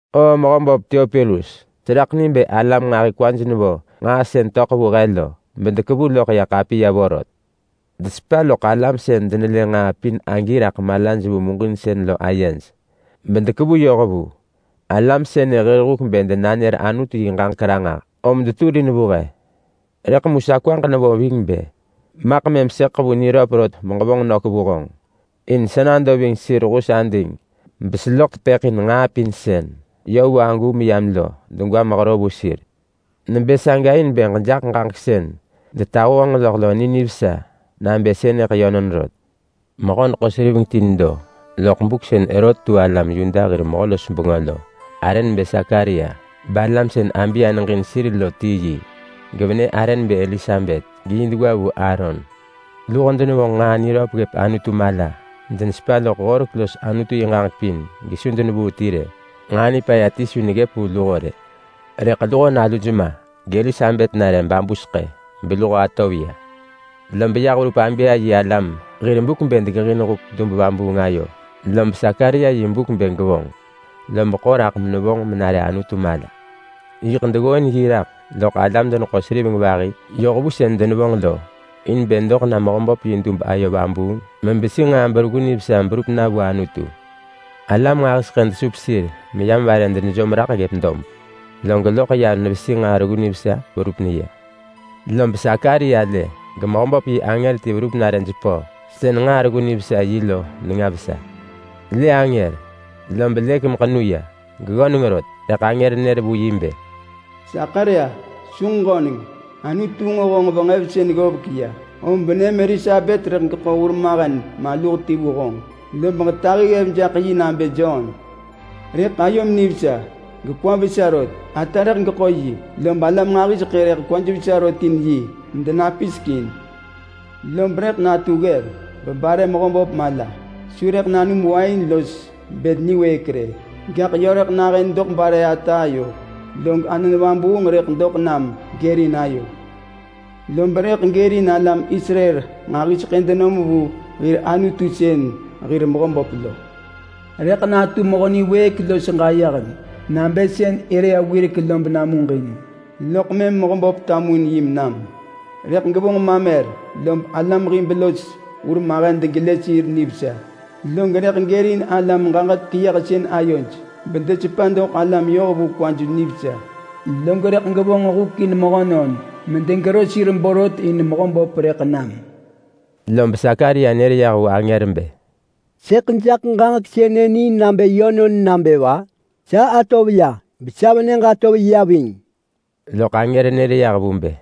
Oo mehö böp Teopilus, seraḳ ni bë alam nġahi kwaj nevo nġaa sën töḳ vu he lo, bedekevu loḳ ya ḳapiya vorot. Desepa loḳ alam sën denelë nġaa pin agi raḳ malaj vu muġinsën lo ayej, bedekevu yoh vu. Alam sënë hir huk bë denanër Anutu yi ġaġek ranġah, om deturin vu he. Rëḳ mu sa kwaġ nevo ving bë maḳ mëm sëḳ ḳevu niröp rot beġevonġ nök vu honġ, in sa nado ving sir hus ading beseloḳ tepëḳ in nġaa pin sën yö vu agu meyam lo degwa mehero vu sir. Nebë saga in bë ġejaḳ ġaġek sën detahu honġ loḳ lo ni nivesa nabë sënëḳ yönon rot. Mehö-neḳo-seriveng ti nedo loḳ buk sën Herot tu alam Yuda hir mehö-los-bengö lo. Arë nebë Sakaria, balam sën Abia neġin sir lo ti yi. Gevenë arë nebë Elisabet, geyi degwa vu Aaron. Luho denevonġ nġaa niröp ggëp Anutu mala. Denesepa loḳ horek los Anutu yi ġaġek pin gesu denevuu ti rë. Nġaa nipaya ti su neggëp vu luho rë. Rëḳ luho naluj ma, gElisabet nare babu seḳë, beluho atov ya. Lob yah verup Abia yi alam hir buk bë degeġin huk dub-vabuung ayo, lob Sakaria yi buk bë gevonġ, lob ḳo raḳ menevonġ menare Anutu mala. Yiḳ deggooin yi raḳ loḳ alam-deneḳo-seriveng vahi yoh vu sën denevonġ lo, in bë doḳ na Mehöböp yi dub ayo vabuung mebesi nġaa bereggu nivesa berup na vu Anutu. Alam nġahiseḳë desup sir meyam vare denejom raḳ ggëp dob, log loḳ ya nevesi nġaa reggu nivesa verup neya. Lob Sakaria lë geMehöböp yi angër ti verup nare jepö sën nġaa reggu nivesa yi lo nenga vesa. Lë angër, lob lëk meḳenu ya, geggöneng rot. Rëḳ angër nër vu yi bë, “Sakaria, su ġeġöneng! Anutu nġo honġ venġevsën ggovek ya, om venëm Elisabet rëḳ geḳo hurmahen maluh ti vu honġ. Lob ġetahi ggev jaḳ yi nabë Jon. Rëḳ ayom nivesa, gekwam vesa rot. Ata rëḳ geḳo yi, lob alam nġahiseḳë rëḳ kwaj vesa rot in yi medenapisek in. Lob rëḳ natu ggev mebare Mehöböp mala. Su rëḳ nanum wain los bël niwëëk rë, gaḳ yö rëḳ nahën doḳ bare ata ayo, log Anon Vabuung rëḳ doḳ nam gërin ayo. Lob rëḳ gërin alam Israel nġahiseḳë denom vu hir Anutu sën hir Mehöböp lo. Rëḳ natu mehö niwëëk los ġayeheng nabë sën Elia wirek lo benamuġin, loḳ mëm Mehöböp tamuin yi menam. Rëḳ gevonġ mamer, lob alam hib los hurmahen degelë sir nivesa. Log rëḳ gërin alam-ġaġek-keyëhsën ayoj bedesepa doḳ alam-yohvu kwaj nivesa. Log rëḳ gevonġ huk in mehönon borot medegero sir in Mehöböp rëḳ nam.” Lob Sakaria nër yah vu angër bë, “Sëḳ jaḳ ġaġek sënë ni nabë yönon nabë va? Sa atov ya, besa venëġ atov ya ving.” Loḳ angër nër yah vu bë,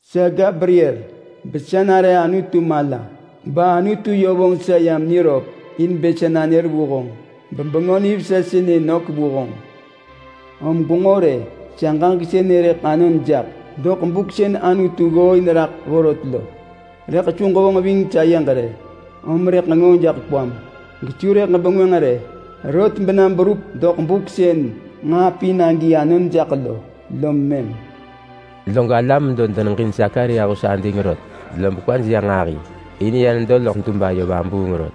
“Sa Gabriel, besa nare Anutu mala, bAnutu yö vonġ sa yam niröp in bë sa nanër vu honġ, meġevonġ bengö nivesa sënë nök vu honġ. Om gwenġo rë! Sa ġaġek sënë rëḳ anon jaḳ doḳ buk sën Anutu ggooin raḳ vorot lo. Rëḳ su ġevonġ ving sayeġ rë, om rëḳ ġenġoo jaḳ kwam, gesu rëḳ ġebengwënġ rë, rot bena berup doḳ buk sën nġaa pin agi anon jaḳ lo, lom mëm.” Log alam medo deneġin Sakaria hus ading rot, lob kwaj ya nġahi, in ya nedo rot loḳ dub ayo vabuung.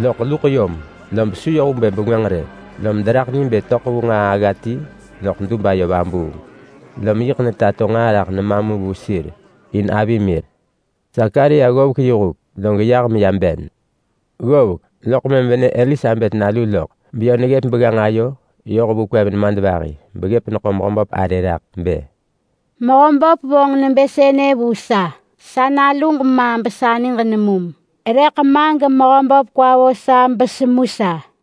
Loḳ luḳ yom, lob su yoh vu bë bengwënġ rë. Lom deraḳ ni bë töḳ vu nġaa agga ti loḳ dub ayo vabuung. Lom yiḳ netato nġaa raḳ nema mu vu sir, in avi mir. Loḳ Sakaria ggovek yi huk, log yah meya ben. Ggovek, loḳ mëm venë Elisabet nalu loḳ, beyö neggëp begganġ ayo yoh vu kwev nemadvahi beggëp neḳo Mehöböp arë raḳ bë, “Mehöböp vonġ nebë sënë vu sa. Sa naluġ ma besa niġ nemum, rëḳ ma geMehöböp kwa vo sa besemu sa.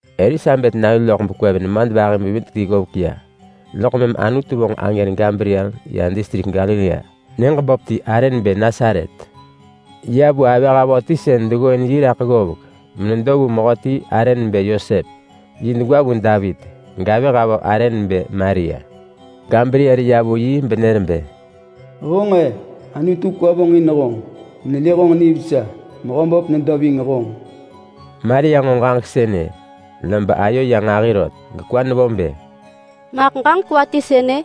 Elisabet nalu loḳ bekwev nemadvahi bevidek ti ggovek ya, loḳ mëm Anutu vonġ angër Gabriel ya distrik Galilea nyëġ böp ti arë nebë Nasaret. Ya vu avëh avö ti sën deggooin yi raḳ ggovek menedo vu mehöti arë nebë Yosep. Yi degwa vu Davit. Gavëh avö arë nebë Maria. Gabriel ya vu yi benër bë, “Honġ-e! Anutu kwa vonġin honġ, menelë honġ nivesa. Mehöböp nedo ving honġ.” Maria nġo ġaġek sënë, lob ayo ya nġahi rot, gekwa nevo bë, “Maḳ ġaġek va ti sënë?”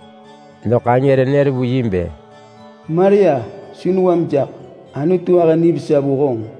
Loḳ angër nër vu yi bë, “Maria, su newam jaḳ. Anutu ahë nivesa vu honġ.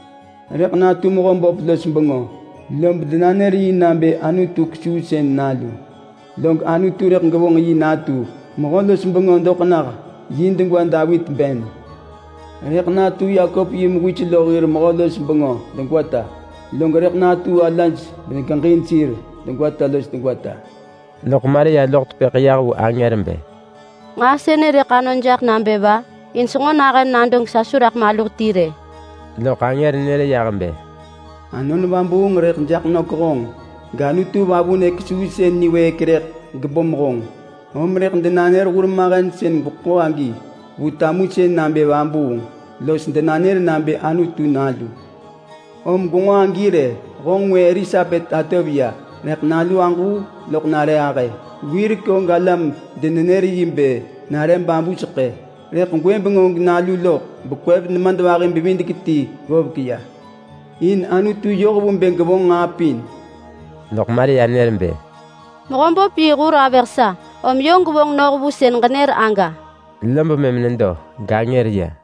Rëḳ natu Mehöböp los bengö, lob denanër yi nabë Anutu Kesuusën nalu. Log Anutu rëḳ gevonġ yi natu mehö-los-bengö doḳ nah yi degwa Davit ben. Rëḳ natu Yakop yi mewis lo hir mehö-los-bengö degwata. Lob rëḳ natu alaj megeġin sir degwata los degwata.” Loḳ Maria loḳ tepëḳ yah vu angër bë, “Nġaa sënë rëḳ anon jaḳ nabë va, in senġo nahën nado gesa su raḳ maluh ti rë?” Loḳ angër nër yah bë, “Anon Vabuung rëḳ jaḳ nök honġ, gAnutu Vavunë Kesuusën niwëëk rëḳ gebom honġ. Om rëḳ denanër hurmahen sën gweḳo agi vu tamusën nabë vabuung, los denanër nabë Anutu Nalu. Om gwenġo agi rë! Honġ ngwë Elisabet atov ya, rëḳ nalu aġuu loḳ nare ahë. Wirek og alam denenër yi bë nare babu seḳë, rëḳ gwëbeng og nalu loḳ bekwev nemadvahi-bevidek-ti ggovek ya. In Anutu yoh vu bë gevonġ nġaa pin.” Loḳ Maria nër bë, “Mehöböp yi hur avëh sa, om yö gevonġ noh vu sën ġenër aga.” Lob mëm nedo gangër ya.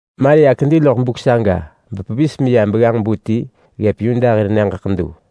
Maria kedi loḳ buk saga bepevis meya begganġ-bu ti ggëp Yuda hir nyëġ ḳedu,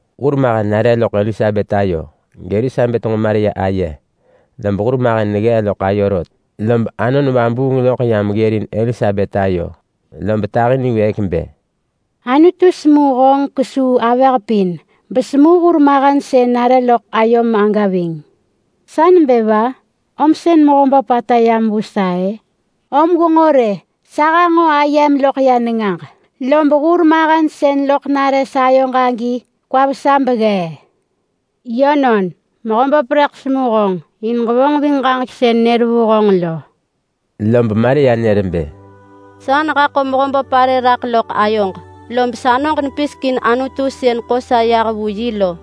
Hurmahen nare loḳ Elisabet ayo, gElisabet nġo Maria aye, lob hurmahen neggee loḳ ayo rot. Lob Anon Vabuung loḳ yam ggërin Elisabet ayo, lob tahi niwëëk bë, “Anutu semu honġ kesuu avëh pin. Besemu hurmahen sën nare loḳ ayom aga ving. Sa nebë va om sën Mehöböp ata yam vu sa-ë? Om gwenġo rë, sa hanġo ayem loḳ ya nengaġ, lob hurmahen sën loḳ nare sayoġ agi kwa vesa beggee. Yönon, Mehöböp rëḳ semu honġ in ġevonġ ving ġaġek sën nër vu honġ lo.” Lob Maria nër bë: “Sa nehaḳo Mehöböp arë raḳ loḳ ayoġ. Lob sanoġ nepisek in Anutu sën ḳo sa yah vu yi lo.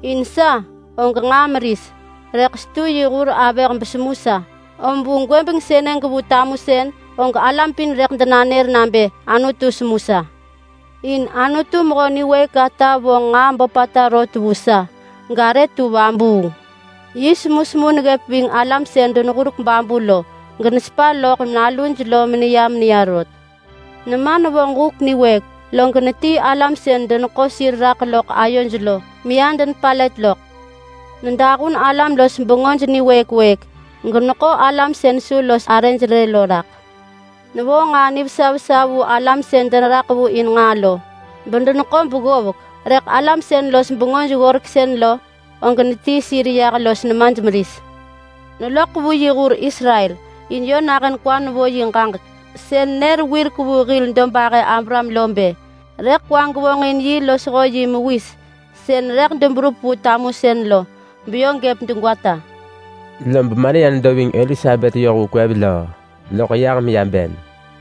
In sa og nġaa meris, rëḳ setu yi hur avëh besemu sa. Om vu gwëbeng sënë gevu tamusën, og alam pin rëḳ denanër nabë Anutu semu sa. In Anutu Mehö Niwëëk ata vonġ nġaa böpata rot vu sa, garë tu vabuung. Yi semusemu neggëp ving alam sën deneggurek babu lo, genesepa loḳ naluj lo meneya meneya rot. Nema nevonġ huk niwëëk, log netii alam sën deneḳo sir raḳ loḳ ayoj lo, meya denepalët loḳ. Nedahun alam-los-bengöj niwëëk wëëk, geneḳo alam sën su los arëj rë lo raḳ. Nevo nġaa nivesa vesa vu alam sën deneraḳ vu in nġaa lo, bedeneḳo beggovek, rëḳ alam sën los bengöj-ggoreksën lo, og netii sir yah los nemaj meris. Neloḳ vu yi hur Israel, in yö nahën kwa nevo yi ġaġek sën nër wirek vu hil dobahë Abraham lo bë rëḳ kwa gevonġin yi losho yi mewis sën rëḳ deberup vu tamusën lo, beyö gëp degwata.” Lob Maria nedo ving Elisabet yoh vu kwev löö, loḳ yah meya ben.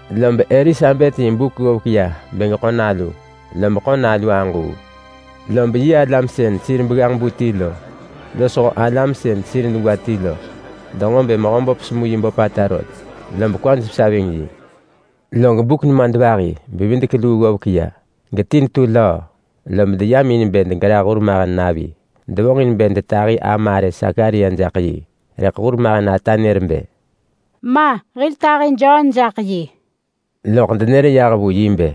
Lob Elisabet yi buk ggovek ya bë geḳo nalu, lob ḳo nalu aġuu. Lob yi alam sën sir begganġ-bu ti lo losho alam sën sir degwa ti lo denġo bë Mehöböp semu yi böpata rot, lob kwaj vesa ving yi. Log buk nemadvahi-bevidek-luu ggovek ya, geti netu löö, lob deyam in bë degerah hurmahen navi. Devonġin bë detahi ama arë Sakaria jaḳ yi, rëḳ hurmahen ata nër bë, “Ma! Hil tahi Jon jaḳ yi.” Loḳ denër yah vu yi bë,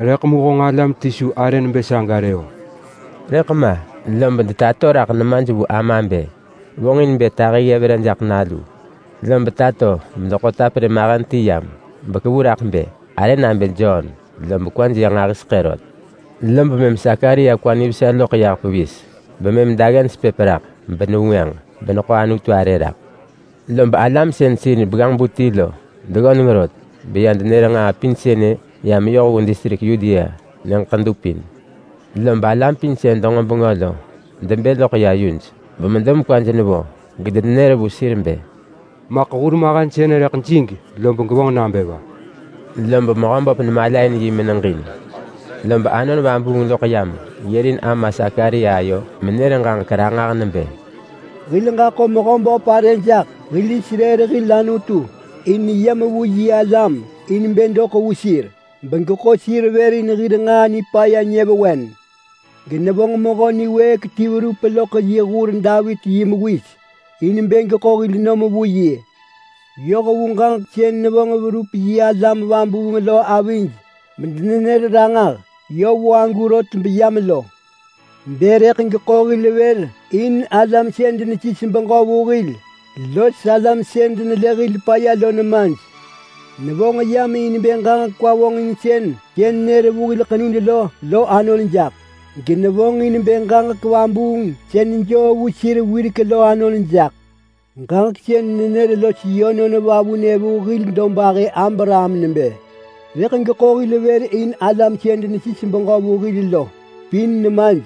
“Rëḳ mu honġ alam ti su arë nebë saga rë-o.” Rëḳ ma, lob detato raḳ nemaj vu ama bë vonġin bë tahi ggev re jaḳ nalu, lob tato bedeḳo taperë mahen ti yam bekevu raḳ bë: “Arë nabë Jon.” Lob kwaj ya nġahiseḳë rot. Lob mëm Sakaria kwa nivesa loḳ yah pevis, bemëm daggen sepëp raḳ benevengwënġ, beneḳo Anutu arë raḳ. Lob alam sën sir begganġ-bu ti lo deggöneng rot, beya denër nġaa pin sënë ya meyoh vu distrik Yudea nyëġ ḳedu pin. Lob alam pin sën denġo bengö lo debë loḳ ya yuj, bemedo mekwaj nevo, medenenër vu sir bë, “Maḳ hurmahen sënë rëḳ jig lob gevonġ nabë va?” Lob Mehöböp nemalain yi meneġin. Lob Anon Vabuung loḳ yam ggërin ama Sakaria ayo bevonġ menër ġaġek ranġah nebë: “Hil ġaḳo Mehöböp arë jaḳ, hil Israel hil Anutu. In yam vu yi alam in bë doḳ vu sir begeḳo sir vër in hir nġaa nipaya nyëvewen. Genevonġ mehö niwëëk ti verup loḳ yi hur Davit yi mewis in bë geḳo hil nom vu yi. Yoh vu ġaġek sën nevonġ verup yi alam vabuung lo avij bedenenër ranġah yö vu agu rot beyam lo. Bë: Rëḳ geḳo hil vër in alam sën denesis beġö vu hil los alam sën denelë hil paya lo nemaj. Nevonġ yam in bë ġaġek kwa-vonġinsën sën nër vu hil ḳenud lo lo anon jaḳ, genevonġ in bë ġaġek vabuung sën joo vu sir wirek lo anon jaḳ. Ġaġek sën nenër los yönon vavunë vu hil dobahë Abraham nebë: Rëḳ geḳo hil vër in alam sën denesis beġö vu hil lo pin nemaj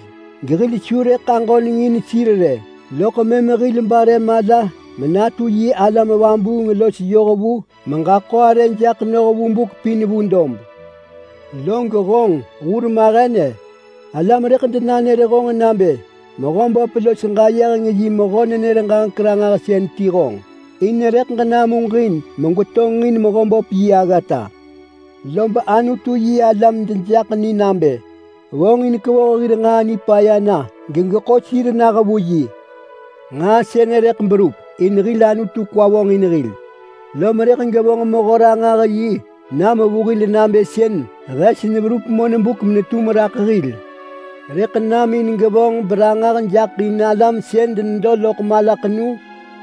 gehil su rëḳ aġönengin sir rë, loḳ mëm hil bare mala menatu yi alam vabuung los yohvu meġaḳo arë jaḳ noh vu buk pin vu dob. Log honġ, hur mahen-e! Alam rëḳ denanër honġ nabë Mehöböp los ġayeheng yi mehö-nenër-ġaġek-ranġahsën ti honġ. In rëḳ ġenamuġin megwetonġin Mehöböp yi aggata, lob Anutu-yi-alam dejaḳ ni nabë vonġin kevoh hir nġaa nipaya na, gegeḳo sir nah vu yi. Nġaa sënë rëḳ berup in hil Anutu kwa vonġin hil, lom rëḳ gevonġ Mehö-ranġah-yi nam vu hil nabë sën hes neverup monbuk menetum raḳ hil. Rëḳ nam in gevonġ beranġah jaḳ in alam sën denedo loḳ malaḳenu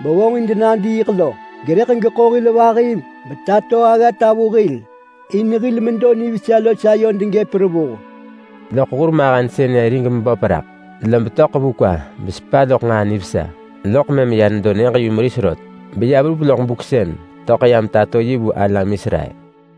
bevonġin denadiiḳ lo, gerëḳ geḳo hil vahi betato aggata vu hil in hil medo nivesa los ayod gëp revuh.” Loḳ hurmahen sënë rig meböp raḳ, lob töḳ vu kwa besepa loḳ nġaa nivesa. Loḳ mëm ya nedo nyëġ-yumeris rot beya verup loḳ buk sën töḳ yam tato yi vu alam Israel.